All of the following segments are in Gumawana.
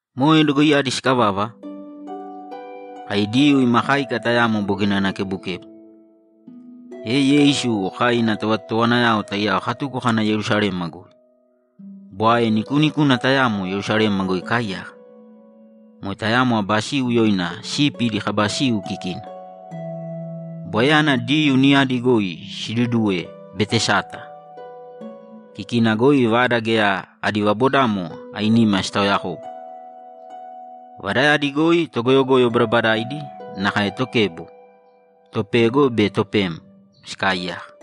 Moe dogoiyadi sikavava, kai Diyuu ima káika tayamo bogina ana kebukebu, e Yeisu kai ina tovatotowanayao taiyao katuko kana Yerusalema goi. Bwae nikuunikuna tayamo Yerusalema goi ikaaiyaka. Moe tayamo aba siu yoina Sipi Idi Kaba Siu kikina. Bwaeyana Diyuu niyadi goi siduduwe Betesata. Kikina goi vada geya adi vabodamo ainima sitaoyakobu. Vadayadi goi togoyogoyo badabadaidi, nakae tokebo, topego be topem, sikaaiyaka.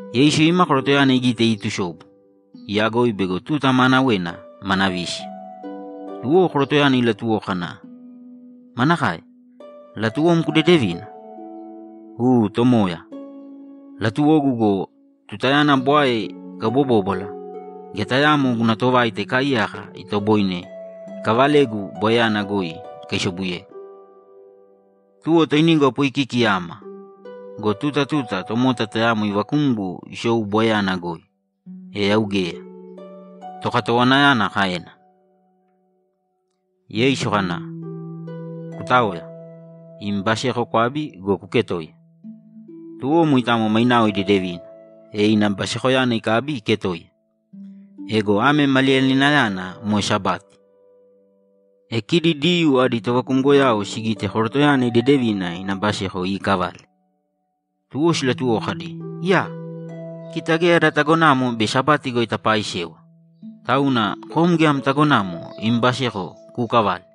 Yeisu ima korotoyana igite iitusobu, iyagoi bego tuta maanawena mana vísiya. Tuwo korotoyana ilatuwoko kana, ‘Manakae? Latuwom kudedevina?’ ‘U, Tomoya, latuwogu go, tutayana bwae ikaubobóbwala, geya tayaamo guna tovaita ikaaiyaka itoboine ikavalegu bwaeyana goi ikaisobuyegu. Tuwo toinigu apoikiki ama go, tuta tuta tomota tayamo ivakumgo isou bwaeyana goi, e yau geya’, tokatowanayana kaena. Yeisu kana, ‘Kutāoya, im baseko kwābi go, kuketōiya!’ Tuwo moitamo mainao idedevina, e ina basekoyana ikabi iketoiya. Ego ame maliyalinayana moe Sabati. E kidi Diyuu adi tovakumgoyao sigite korotoyana idedevina ina baseko iikavale, tuwo silatuwoko kadi, ‘Iyaa! Kita geya ada tagonamo bei Sabati goi tapaaisewa, tauna kom geya am tagonamo im baseko kuukavale.’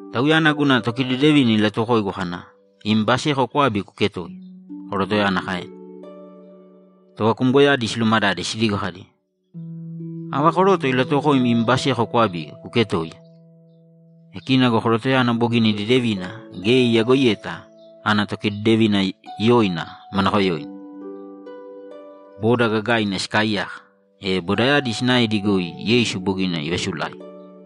‘Tauyana guna tokidedevina ilatuwokoigu kana, “Im baseko kwābi kuketōiya”’, korotoyana kaena. Tovakumgoyadi silumadade sidigo kadi, ‘Ava koroto ilatuwokoim im baseko kwabi kuketoiya?’ E kina go korotoyana bogina idedevina geya iyagoiyeta ana tokidedevina yoina manakoyoina. Boda gagaina sikaaiyaka, e bodayadi sinaedi goi Yeisu bogina ivasulaigi.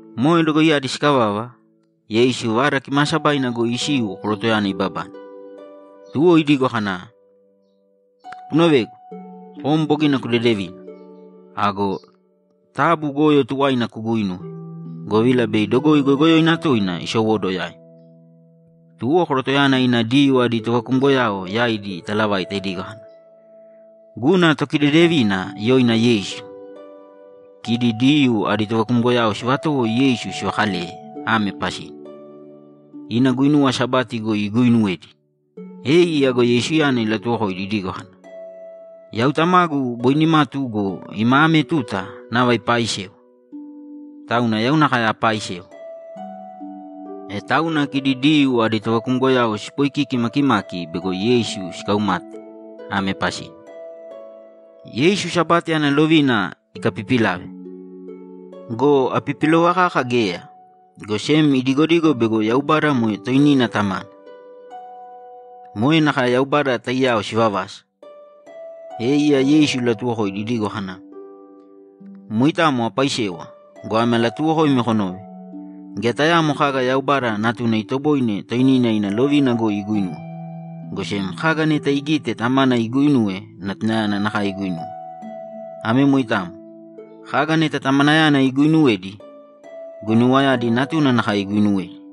Moe dogoiyadi sikavava, Yeisu Vada Kimaasabaina goi isiu korotoyana ibabane, tuwo idigo kana, ‘Kunovēgu! Kom bogina kudedevina. Ago taabu goyo tuwaina kuguuinūwe, govila bei dogoi goyogoyoina toina isowóduwo yaim.’ Tuwo korotoyana ina Diyuu adi tovakumgoyao yaidi italavaita idigo kana, ‘Guna tokidedevina yoina Yeisu.’ Kidi Diyuu adi tovakumgoyao sivatowo Yeisu sivakaleye ame pasina: Ina guinuwa Sabati goi iguuinuwedi. E iya go Yeisu ilatuwokoidi idigo kana, ‘Yau Tamagu boi nimatu go, ima ame tuta nava ipaaisewa, tauna yau nakae apaaisewa.’ E tauna kidi Diyuu adi tovakumgoyao sipoikiki makimaki bego Yeisu sikaumate ame pasina: Yeisu Sabati ana lovina ikapipilave. Go apipilova kaka geya, go sem idigodigo bego Yaubada moe toinina Tamana. Moe nakae Yaubada taiyao sivavasa. E iya Yeisu ilatuwokoidi idigo kana, ‘Moitamo apaaisewa go, ame alatuuwokoimi konōve: Geya tayaamo kaga Yaubada Natuna itoboine toinina ina lovina goi iguinuwe, go sem kaga neta igite Tamana iguuinuwe Natunayana nakae iguuinuwe. Ame moitamo. Kaga neta Tamanayana iguuinuwedi, guinuwayadi Natuna nakae iguuinuwedi.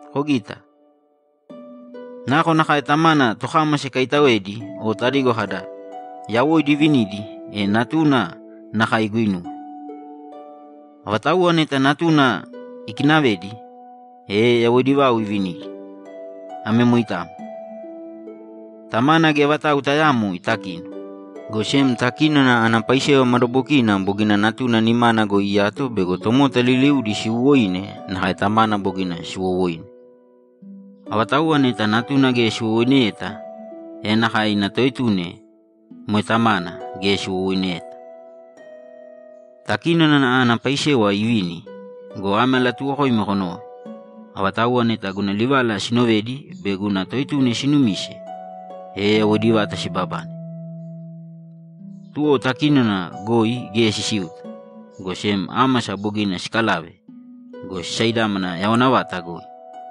Kogita. Nakonakae Tamana tokámasa ikaitaoedi o tadigo kada, “Yawoidi ivinidi”, e Natuna nakae iguinuwe. Avatauwa neta Natuna ikinavedi, e yawoidi vau ivinidi. Ame moitamo. Tamana geya vatau tayaamo itakino, go sem takínona ana paisewa madabokina bogina Natuna nimana goi iyato bego tomota liliudi siwowoine nakae Tamana bogina siwowoine. Avatauwa neta Natuna geya siwowoineyeta, e nakae ina Toetuna, moe Tamana, geya siwowoineyeta. Takínona ana paisewa ivini go, ame alatuuwokoimi konōve: Avatauwa neta guna livala sinovedi be guna Toetuna sinumise, e yawoidi vata sibabane. Tuwo takínona goi geya sisiuta, go sem ámasa bogina sikalave go, sisaidámana yawana vata goi.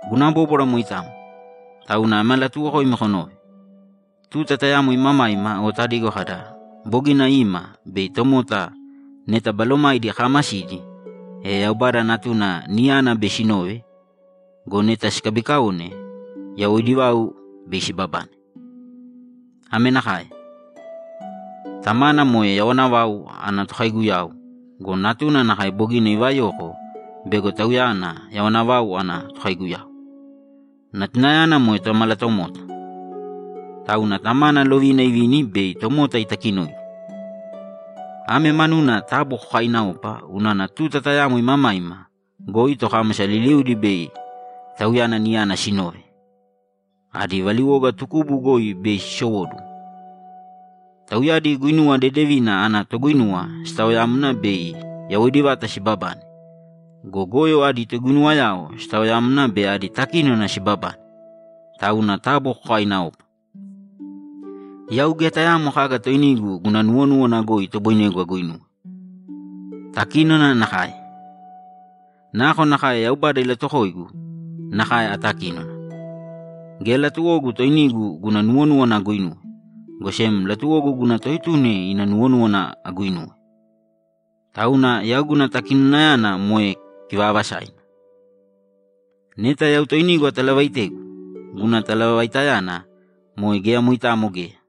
Guna bóbwara moitamo, tauna ame alatuuwokoimi konōve: Tuta tayamo imamaima o tadigo kada, “Bogina ima” bei tomota neta balomaidi kaamasidi, e Yaubada Natuna niyana bei sinove go, neta sikabikaone, yawoidi vau bei sibabane. Ame nakae: Tamana moe yawana vau ana tokaiguyau go, Natuna nakae bogina ivayoko bego Tauyana yawana vau ana tokaiguyau. Natunayana moe Tomalatomota, tauna Tamana lovina ivini bei tomota itakinoidi. Ame manuna taabu kokaaināopa unana tuta tayamo imamaima goi tokámasa liliudi bei Tauyana niyana sinove, adi valiwoga tukubu goi bei sisowóduwo. Tauyadi guinuwa dedevina ana toguinuwa sitaoyamna bei yawoidi vata sibabane go, goyo adi toguinuwayao sitaoyamna bei adi takínona sibabane. Tauna taabu kokaaināopa. Yau geya tayaamo kaga toinigu guna nuwonúwana goi itoboinegu aguinuwe. Takinona nakae. Nakonakae Yaubada ilatuwokoigu, nakae atakínona. Geya latuwogu toinigu guna nuwonúwana aguinuwe, go sem latuwogu guna Toetuna ina nuwonúwana aguuinuwe. Tauna yau guna takinonayana moe kivaavasaina. Neta yau toinigu atalavaitegu, guna talavaitayana moe geya moitamo geya.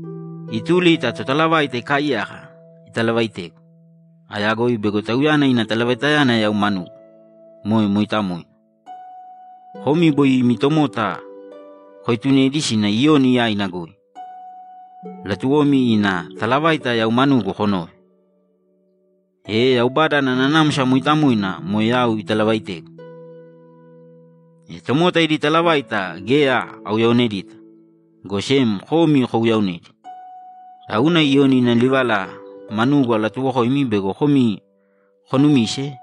Ituli ta totalavaita ikaaiyaka italavaitegu. Ayagoi bego Tauyana ina talavaitayana yau manugu, moe mooitamoina. Komi boi imi tomota koetunedi sina Iyoni yaina goi; latuwomi ina talavaita yau manugu konove, e Yaubada ana Nanamsa Mooitamoina moe yau italavaaitegu. E tomota idi talavaita geya auyaonedita, go sem komi kouyaonedi, tauna Iyoni ina livala manugu alatuuwokoimi bego komi konumise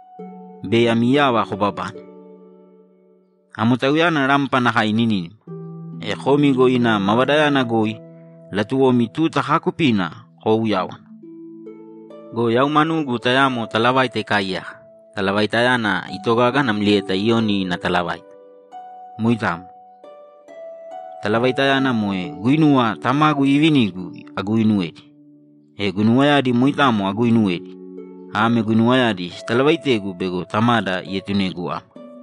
bei ami yava kobabane. Amo tauyana rampa nakae ininínima. E komi go ina mavadayana goi latuwomi tuta kaakupina koouyáwana. Go yau manugu tayamo talavaita ikaaiyaka; talavaitayana itogaga namlieta Iyoni ina talavaita. Moitamo. Talavaitayana moe guinuwa Tamagu iivinigu aguinuwedi, e guinuwayadi moitamo aguuinuwedi. Ame guinuwayadi sitalavaitegu bego Tamada ietunegu ama.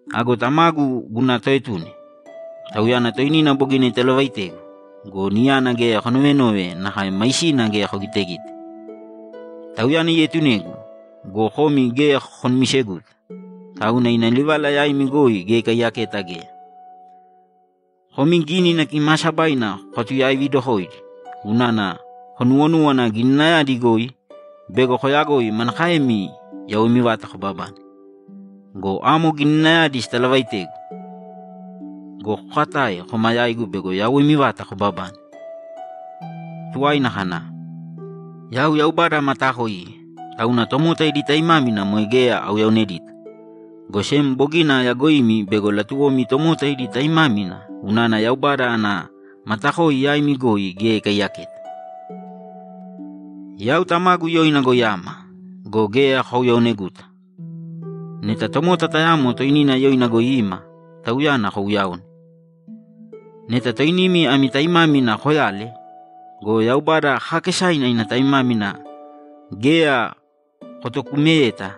Ago Tamagu guna Toetuna, Tauyana toinina bogina italavaitegu go, niyana geya konovenove nakae maisina geya kogitegite. Tauyana ietunegu go, komi geya konumiseguta, tauna ina livala yaimi goi geya ikaiyaketa geya. Komi Gínina Kimaasabaina kokatuyaividokoidi unana konuwonúwana Gininayadi goi bei koyagoi manakaemi yawoimi vata kobabane. Go amo Gininayadi sitalavaaitegu! Go kokatae koma yaigu bego yawoimi vata kobabane.’ Tuwaina kana, ‘Yau Yaubada amataakoiye, tauna tomota idi taimámina moe geya auyaonedita, go sem bogina ayagoimi bego latuwomi tomota idi taimámina unana Yaubada ana matakoi yaimi goi geya ikaiyaketa. Yau Tamagu yoina goi ama go, geya kouyaoneguta. Neta tomota tayamo toinina yoina goi ima, tauyana kouyaone! Neta toinimi ami taimámina koyale go, Yaubada kaakesaina ina taimámina geya kotokumeyeta,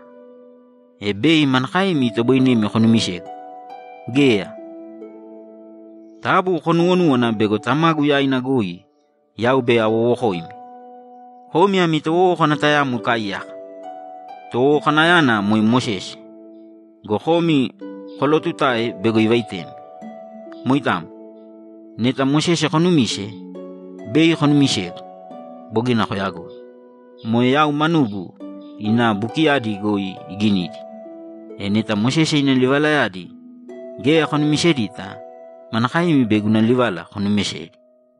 e bei manakaemi itoboinemi konumisegu? Geya! Taabu konuuwonūwana bego Tamagu yaina goi yau bei awowokoimi. Komi ami towowókana tayamo ikaaiyaka. Towowokanayana moe Mosese go, komi kolootutae bego ivaitemi. Moitamo. Neta Mosese konumise, bei konumisegu. Bogina koyagoi. Moe yau manugu ina bukiyadi goi iginidi! E neta Mosese ina livalayadi geya konumisedita, manakaemi bei guna livala konumisedi?’